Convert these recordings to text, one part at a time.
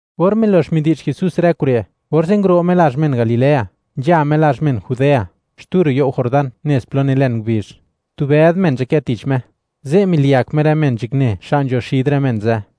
Or milox midi'zh Jesús rë kure', orze' nguro' Me lazh men Galilea, nzha Me lazh men Judea, xtu ro' you' Jordán nez plo nilen ngubizh. Tu bëd men nzhakë tich Me; ze' miliyak Me rë men nzhakne xa' nzho xid rë men ze'.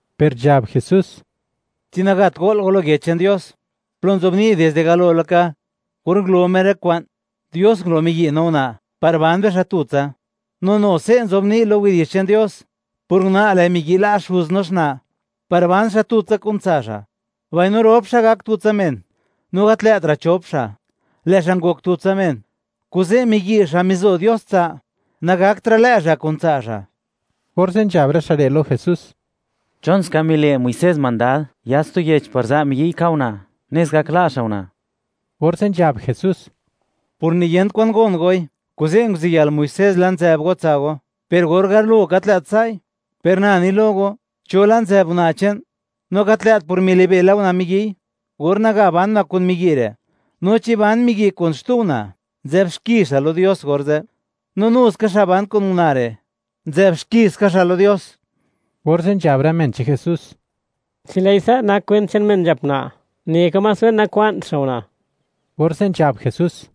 Per nzhab Jesús: ―¿Chi nagat go'l go lo Yech che'n Dios, plo nzobni', dizde galo laka, or ngulo Me rë kwa'n, Dios ngulo miyi' no una' par ban bixa' tutsa? No nu se' nzobni' lo Yech che'n Dios: “Por una', lë' miyi' la' xuz no xna' par ban xa' tutsa kun tsa' xa', mbaino rop xa' gak tutsa men.” No gat lë'tra' chop xa', lë' xa' ngok tutsa men. Kuze', miyi' xa' mizo Dios tsa', nagaktra' lë' xa' kun tsa' xa'. Orze' nzhab rë xa' re' lo Jesús: ―¿Chon ska mile' Muisés mandad: “Yats tu yech par za' miyi'y ka' una', nes gak la' xa' una'”? Orze' nzhab Jesús: ―Por niyent kwan gon goi, kuze' nguziyël Muisés la' nzë'b go tsa' go, per or galo gat lë't sa'i. Per na ni lo go, cho la' nzë'b una' che'n, no gat lë't por milibe' la una' miyi'y or naga ban una' kun miyi' re', no chi ban miyi' kun xtu una', nzë'b xki xa' lo Dios orze'. No nu ska, xa' ban kun una' re', nzë'b xki ska xa' lo Dios. Orze' nzhab rë men che'n Jesús: ―Chi lë'i sa' nak kwent che'n men nzhap una', neka más wen nakwa'nt xa' una'. Orze' nzhab Jesús: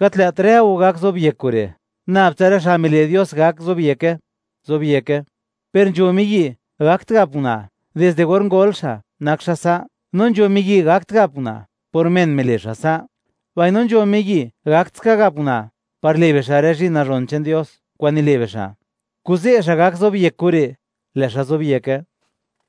―Gat lë't rë go gak zobyek kure', nab tsa rë xa' mile' Dios gak zobyeke, zobyeke. Per nzho miyi' nagakt gap una', dizde or ngol xa', nak xa' sa'; no nzho miyi', nagakt gap una', por men mile' xa' sa'; mbaino nzho miyi' gakt ska gap una', par le' bixa' rë zhi'n nazhon che'n Dios kwa'n nile' bixa'. Kuze', xa' gak zobyek kure', lë' xa' zobyeke.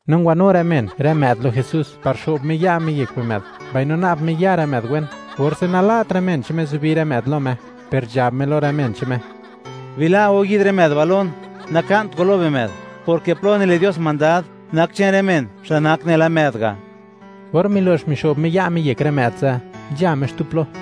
No ngwanu rë men rë më'd lo Jesús par xo'b Me ya' Me yek bimë'd, mbaino na'b Me ya rë më'd wen, orze' nala't rë men che'n Me zubi rë më'd lo Me, per nzhab Me lo rë men che'n Me: ―Bila' go yi'd rë më'd ba' lon, naka'nt go lo bimë'd, porke plo nile' Dios mandad, nak che'n rë men, xa' nak nela më'd ga'. Or milo'x mixo'b Me ya' Me yek rë më'd ze', nzha Me xtu plo.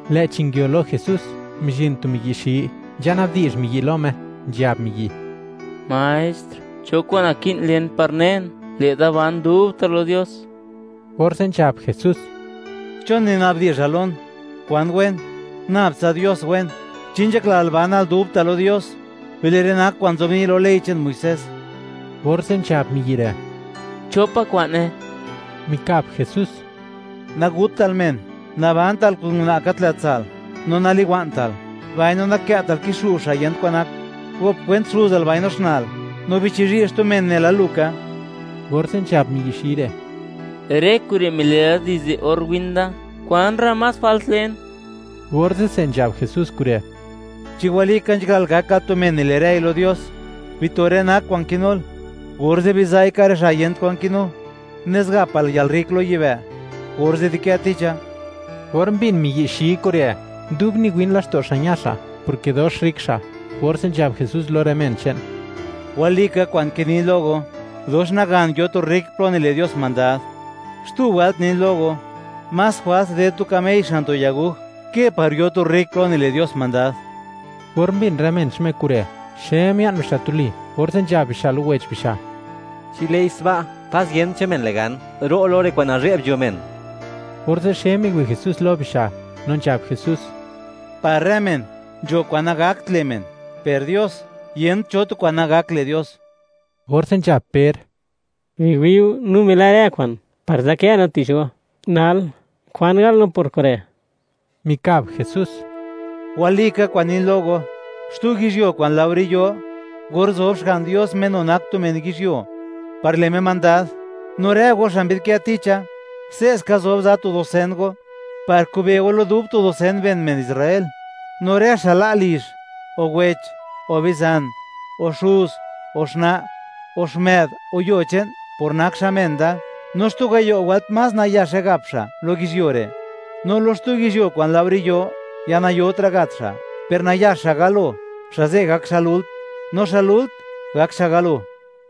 Lë'chi nguio lo Jesús, mizhin tu miyi' xi, nzhana'bdi'zh miyi' lo Me, nzhab miyi': ―Maestr, ¿cho kwa'n naki'n len par nen, lë' da ban dubta' lo Dios? Orze' nzhab Jesús: ―¿Chon mina'bdi'zhal lon, kwan wen? Nabtsa Dios wen. Chi nzhaklal banal dubta' lo Dios, bile' rë nak kwa'n nzobni' lo ley che'n Muisés. Orze' nzhab miyi' re': ―¿Cho pa' kwa'ne? Mikab Jesús: ―Nagutal men, nabantal kun una' gat lë' tsa'l, no naliwa'ntal, mbaino nakë'tal kixu' xa' yent kwan nak, gop kwent xuzal mbaino xna'l, no bichizhi' xtu men nela lu ka. Orze' nzhab miyi' xi re': ―Rë kure' mile la, dizde or win da. ¿Kwan ra' más jwalt len? Orze'se nzhab Jesús kure': ―Chi walika nzhaklal gakal tu men nile' rëi lo Dios, bito rë nak kwa'n kinul, orze' biza'i, ka' rë xa' yent kwan kinu, nes gapal yalrrik lo yibë'; orze' dikë ticha. Or mbin miyi' xi kure', dub niwin laxto' xa', ña xa', porke dox rrik xa'. Orze' nzhab Jesús lo rë men che'n: ―¡Walika kwa'n kinin lo go, dox nagan, yo tu rrik plo nile' Dios mandad! Xtu wëlt nin lo go, más jwals ded tu kamey xan tu yaguj, ke par yo tu rrik plo nile' Dios mandad. Or mbin rë men che'n Me kure', xe mia'n bixa' tuli, orze' nzhab bixa' lo wech bixa': ―Chi lë'i sba', ¡pas yent cho men le' gan, ro' lo rë kwa'n nazhe'b nzho men! Orze' xe miwi' Jesús lo bixa', no nzhab Jesús: ―Par rë men, nzho kwa'n nagakt le' men; per Dios, yent cho tu kwa'n nagakt le' Dios. Orze' nzhab Per: ―Biwi'u, no mila' rë kwa'n, par nzadkë no tich go; nal, ¿kwan gal no por kure'? Mikab Jesús: ―Walika kwa'n nin lo go, xtu yizhyuo kwa'n laore yo, or zob Xga'n Dios Me nu nak tu men yizhyuo, par le' Me mandad; no rë go xa' mbidkë ticha, se'ska zob za tu dusen go, par kube' go lo dub tu dusen ben men Israel. No rë xa' la' lizh, o wech, o bizan, o xuz o xna', o xmë'd, o yuo che'n; por nak xa' men da; no xtu gayo' wëlt más nayaxe gap xa' lo yizhyuo re'; no lo xtu yizhyuo kwa'n laore yo, ya nayotra' gat xa'. Per nayax xa' galo, xa' ze' gak xa' lult; no xa' lult gak xa' galo.